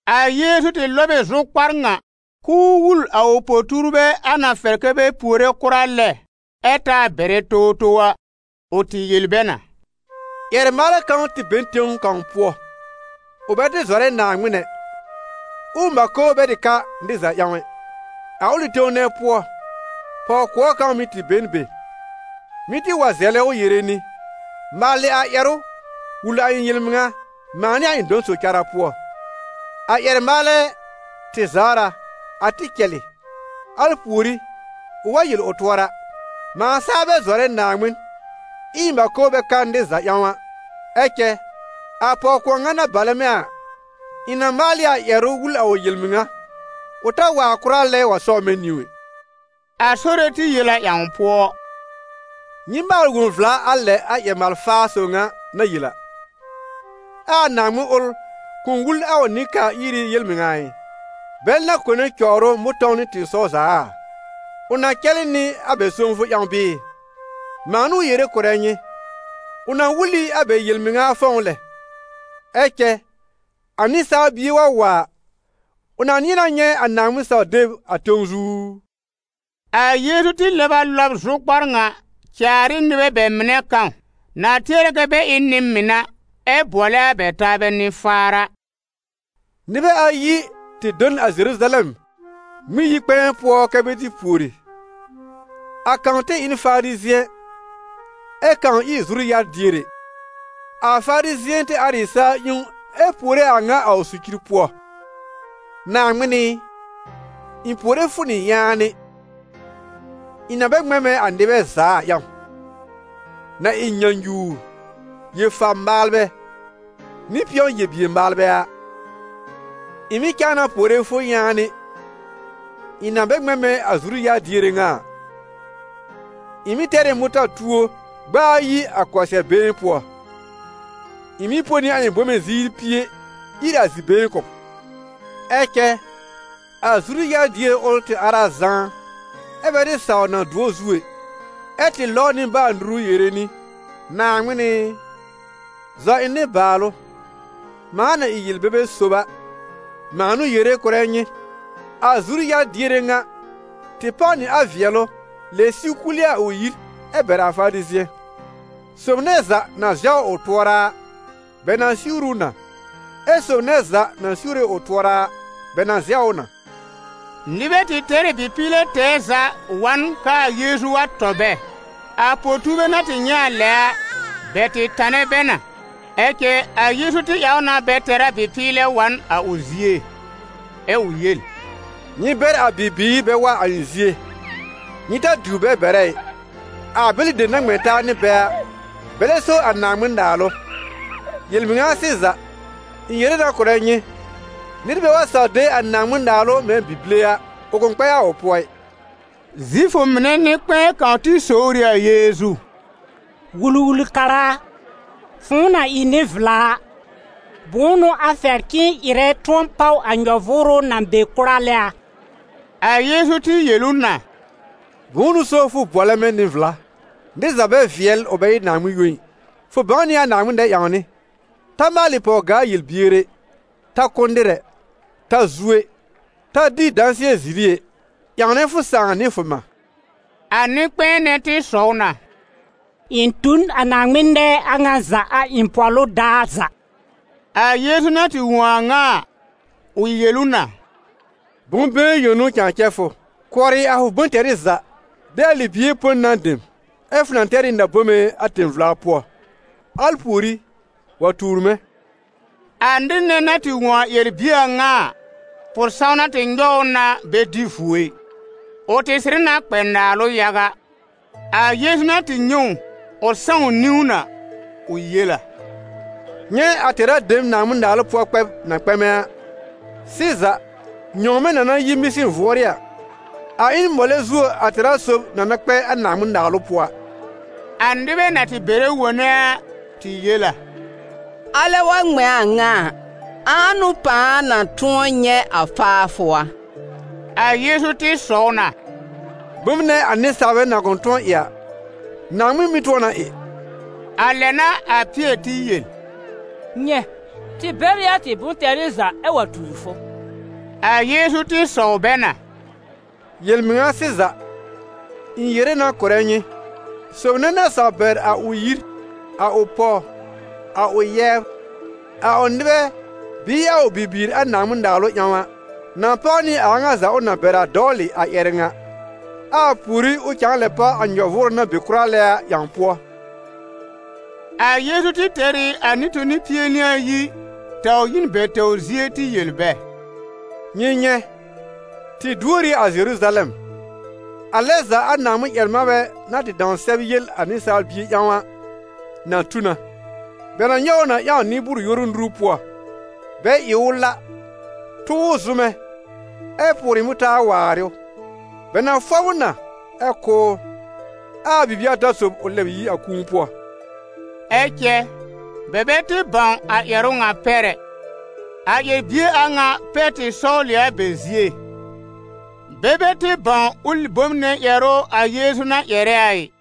A Yeezu tɩ lɔb ɩ zʋkpar ŋa, k'ʋʋ wul a ʋ po-tuurbɛ a na fɛr kɛ́ bɛ puore kʋra lɛ ɛ taa bɛrɛ towtow a. Ʋ tɩ yel bɛ na: «Ƴɛr-maalɛ kãw tɩ be n tẽw kãw pʋɔ. Ʋ bɛ tɩ zɔrɛ Naaŋmɩn ɛ, ɛ ʋ mãko bɛ tɩ ka nɩr za ƴãw ɛ. A ʋlɩ tẽw nɛ pʋɔ, pɔw-kʋɔr kãw mɩ̀ tɩ be n be, mɩ́ tɩ wa zɛlɛ ʋ yere nɩ: ‹Maalɩ a ƴɛrʋ wul a ɩ̃ yel-mɩŋa, mãa nɩ a ɩ̃ dɔ̃ sob cara pʋɔ.› A ƴɛr-maalɛ tɩ zawr a, a tɩ cɛlɩ. Al pùorí, ʋ wa yel ʋ tʋɔra: ‹Mãa saa bɛ zɔrɛ Naaŋmɩn, ɛ ɩ̃ mãko bɛ ka nɩr za ƴãw a, ɛ cɛ a pɔw-kʋɔr ŋa na balɛ mɛ̃ a, ɩ̃ na maal ɩ a ƴɛrʋ wul a ʋ yel-mɩŋa, ʋ ta waar kʋra lɛ wa sɔbr mɛ̃ niwn ɛ!›» A Sore tɩ yel a ƴãw pʋɔ: «Nyɩ maal wõ vla a lɛ a ƴɛr-maal-faa sob ŋa na yel a. Ɛ a Naaŋmɩn ʋl kʋ̃ wul a ʋ nɩ-kaa-iri yel-mɩŋa ɩ, bɛl na kone cɔwr ʋ mʋ̃tɔ̃w nɩ tɩ̃ɩsɔw za a? Ʋ na cɛlɩ nɩ a bɛ sõwfʋ ƴãw bɩɩ? Mãa n'ʋ yere kʋ̀rɛ nyɩ: ʋ na wul ɩ a bɛ yel-mɩŋa fɔ̃w lɛ. Ɛ cɛ a Nɩsaal Bie wa wa a, ʋ na nɩ̃ɛ na nyɛ̃ a Naaŋmɩn-saw-deb a tẽw zu u?» A Yeezu tɩ lɛb a lɔb zʋkpar ŋa caar ɩ nɩbɛ bɛ mɩnɛ kãw na tɩ tɩɛrɛ kɛ bɛ ɩ n nɩ-mɩn a, ɛ bʋɔlɛ a bɛ taabɛ nɩ-faar a: «Nɩbɛ ayi tɩ do n a Zeruzalɛm Ŋmɩn-yi-kpɛ̃ɛ pʋɔ kɛ́ bɛ tɩ pùori; a kãw tɩ ɩ n Farizɩ̃ɛ, ɛ kãw ɩ zuru-yar-diere. A Farizɩ̃ɛ tɩ ar ɩ sa-ƴẽwn, ɛ puore a ŋa a ʋ socir pʋɔ: ‹Naaŋmɩn ɩ, ɩ̃ puore fʋ nɩ yaanɩ, ɩ̃ na bɛ ŋmɛ̃ mɛ̃ a nɩbɛ za a ƴãw, na ɩ nyãnyuwr, yel-fa-maalbɛ, nɩ pɩ̃ɔ-yel-bier-maalbɛ a; ɩ̃ mɩ̀ cãa na puore fʋ yaanɩ, ɩ̃ na bɛ ŋmɛ̃ mɛ̃ a zuru-yar-diere ŋa a. Ɩ̃ mɩ́ tɛr ɩ mʋta-tuo gb'a ayi a kɔsɩɛr-been pʋɔ, ɩ̃ mɩ́ põ nɩ a ɩ̃ bome ziir pie ír zi-been kʋ̀ b.› Ɛ cɛ a zuru-yar-diere ʋl tɩ ar a zãá, ɛ́ bɛ tɩ saw na dʋ̃ɔ zu ɛ, ɛ tɩ lɔbr nɩbaal-nuru yere nɩ: ‹Naaŋmɩn ɩ, zɔ ɩ̃ nɩbaalʋ, mãa na ɩ yel-bebe sob a.› Mãa n'ʋ yere kʋ̀rɛ nyɩ, a zuru-yar-diere ŋa tɩ páw nɩ a vɩɛlʋ lɛb siw kul ɩ a ʋ yir, ɛ bɛr a Farizɩ̃ɛ. Sob nɛ za na zɛwr ʋ tʋɔra a, bɛ na siwr ʋ na, ɛ sob nɛ za na siwre ʋ tʋɔra a, bɛ na zɛw ʋ na.» Nɩbɛ tɩ tɛr ɩ bɩ-pɩɩlɛ tɛɛ za wa n k'aa Yeezu wa tɔ bɛ. A po-tuurbɛ na tɩ nyɛ̃ a lɛ a, bɛ tɩ tanɛ bɛ na. Ɛ cɛ a Yeezu tɩ ƴãw na bɛ tɛr a bɩ-pɩɩlɛ wa n a ʋ zie, ɛ ʋ yel: «Nyɩ bɛr a bibiir bɛ wa a ɩ̃ zie, nyɩ ta diwr bɛ bɛrɛ ɩ: a bɛlɩ dem na ŋmɛ̃ taa nɩ bɛ a, bɛlɛ so a Naaŋmɩn-Naalʋ. Yel-mɩŋa sɩza, ɩ̃ yere na kʋ̀rɛ nyɩ: nɩr bɛ wa saw de a Naaŋmɩn-Naalʋ mɛ̃ bi-bile a, ʋ kʋ̃ kpɛ a ʋ pʋɔ ɩ.» Zifʋ mɩnɛ nɩ-kpɛ̃ɛ kãw tɩ sowr ɩ a Yeezu: «Wul-wul-kara a, fʋ̃ʋ na ɩ nɩ-vla a, bʋ̃ʋ n'ʋ a fɛr k'ɩ̃ɩ ɩrɛ tʋ̃ɔ páw a nyɔ-vʋʋrʋ na be kʋra lɛ a?» A Yeezu tɩ yel ʋ na: «Bʋ̃ʋ n'ʋ so fʋ bʋɔlɛ mɛ̃ nɩ-vla? Nɩr za bɛ vɩɛl ʋ bɛ ɩ Naaŋmɩn yõ ɩ. Fʋ bãw nɩ a Naaŋmɩn nɛ-ƴãwnɩ: ‹Ta maalɩ pɔw-gaa-yel-bier ɛ; ta kʋ́ nɩr ɛ; ta zu ɛ; ta dɩ dãsɩɛ ziri ɛ; ƴãwnɛ fʋ sãà nɩ fʋ mã.›» A nɩ-kpɛ̃ɛ nɛ tɩ sɔw na: «Ɩ̃ tu n a Naaŋmɩn nɛɛ a ŋa za a ɩ̃ pɔ̀lʋ daar za.» A Yeezu na tɩ wõ a a ŋa a, ʋ yel ʋ na: «Bʋ̃-been yõ n'ʋ cãa cɛ fʋ: kʋɔrɩ a fʋ bʋ̃-tɛrɩ za, de a libie põ nan dem, ɛ fʋ na tɛr ɩ na-bome a tẽ-vla pʋɔ, al pùorí, wa tuur mɛ̃.» A nɩr nɛ na tɩ wõ a ƴɛr-bie a ŋa a, pʋ-sãwna tɩ nyɔw ʋ na bɛ dɩ vuo ɩ, ʋ tɩ sɩrɩ na kpɛ naalʋ yaga. A Yeezu na tɩ nyɛ̃ ʋ, ʋ sãw niwn a, ʋ yel a: «Nyɛ̃ a tɛra dem Naaŋmɩn-Naalʋ pʋɔ kpɛb na kpɛmɛ a! Sɩza, nyɔ̃wmɛ̃ na na yi mɩsɩn vʋɔ́rɩ́ a, a ɩ n mɔlɛ zuo a tɛra sob na na kpɛ a Naaŋmɩn-Naalʋ pʋɔ a.» A nɩbɛ na tɩ bɛrɛ wone a, tɩ yel a: «Alɛ wa ŋmɛ̃ a ŋa a, ãa n'ʋ pãa na tʋ̃ɔ nyɛ̃ a faafʋ a?» A Yeezu tɩ sɔw na: «Bom nɛ a nɩsaalbɛ na kʋ̃ tʋ̃ɔ ɩ a, Naaŋmɩn mɩ́ tʋ̃ɔ na ɩ.» A lɛ n'a a Pɩɛr tɩ yel: «Nyɛ̃, tɩ bɛr ɩ a tɩ bʋ̃-tɛrɩ za ɛ wa tuur fʋ.» A Yeezu tɩ sɔw bɛ na: «Yel-mɩŋa sɩza, ɩ̃ yere na kʋ̀rɛ nyɩ, sob nɛ na saw bɛr a ʋ yir, a ʋ pɔw, a ʋ yɛbr, a ʋ nɩbɛ bɩɩ a ʋ bibiir a Naaŋmɩn-Naalʋ ƴãw a, na páw nɩ a a ŋa za ʋ na bɛr a dɔwlɩ, a ƴɛrɛ ŋa, ɛ a pùorí ʋ cãa lɛ páw a nyɔ-vʋʋrʋ na be kʋra lɛ a ƴãw pʋɔ.» A Yeezu tɩ tɛr ɩ a nɩ-toni pie nɩ ayi taw yi n bɛ tɛwr zie tɩ yel bɛ: «Nyɩ nyɛ̃, tɩ duor ɩ a Zeruzalɛm. A lɛ za a Naaŋmɩn-ƴɛr-manbɛ na tɩ dãw sɛb yel a Nɩsaal Bie ƴãw a, na tu na. Bɛ na nyɔw ʋ na ƴãw nɩ-bʋʋr-yoru nuru pʋɔ, bɛ ɩ ʋ la, tʋ ʋ zʋmɛ, ɛ pʋʋrɩ mʋtaar waarɩ ʋ; bɛ na fɔb ʋ na, ɛ kʋ́ ʋ, ɛ a bibie ata sob ʋ lɛb yi a kũu pʋɔ.» Ɛ cɛ bɛ bɛ tɩ bãw a ƴɛrʋ ŋa pɛr ɛ. A ƴɛr-bie a ŋa pɛr tɩ sɔwl ɩ a bɛ zie, bɛ bɛ tɩ bãw ʋlɩ bom nɛ ƴɛrʋ a Yeezu na ƴɛrɛ a ɩ.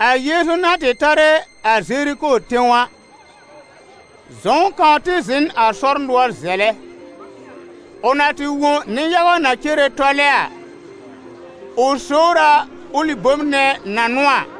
A Yeezu na tɩ tarɛ a Zeriko tẽw a, zɔ̃w kãw tɩ zɩ̃ n a sɔr nʋɔr zɛlɛ. Ʋ na tɩ wõ nɩ-yaga na cere tɔlɛ a, ʋ sowr a ʋlɩ bom nɛ na n'ʋ a.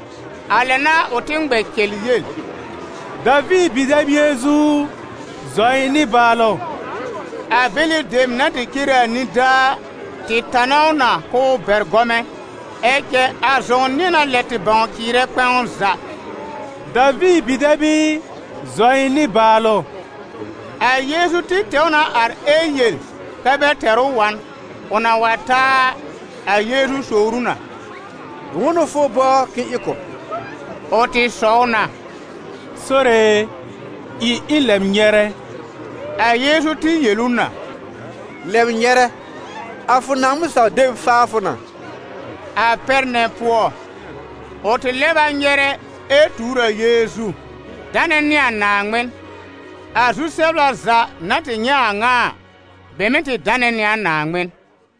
A lɛ n'a ʋ tɩ ŋmɛ cɛl yel: « Daviir bi-dɛb Yeezu u, zɔ ɩ̃ nɩbaalʋ!» A bɛlɩ dem na tɩ cere a nidaa a, tɩ tanɛ ʋ na k'ʋʋ bɛr gɔmɛ̃, ɛ cɛ a zɔ̃w nɩ̃ɛ na lɛ tɩ bãw cɩɩrɛ kpɛ̃w za: «Daviir bi-dɛb ɩ, zɔ ɩ̃ nɩbaalʋ!» A Yeezu tɩ tɛw na ar ɛ yel kɛ́ bɛ tɛr ʋ wa n. Ʋ na wa ta a, a Yeezu sowr ʋ na: «Bʋ̃ʋ n'ʋ fʋ bɔbr k'ɩ̃ɩ ɩ kʋ̀ b?» Ʋ tɩ sɔw na: «Sore e, ɩ ɩ̃ lɛb nyɛrɛ!» A Yeezu tɩ yel ʋ na: «Lɛb nyɛrɛ, a fʋ Naaŋmɩn saw-deb faa fʋ na.» A pɛr nɛ pʋɔ, ʋ tɩ lɛb a nyɛrɛ ɛ tuur a Yeezu, danɛ nɩ a Naaŋmɩn. A zu-sɛbla za na tɩ nyɛ̃ a a ŋa a, bɛ mɩ̀ tɩ danɛ nɩ a Naaŋmɩn.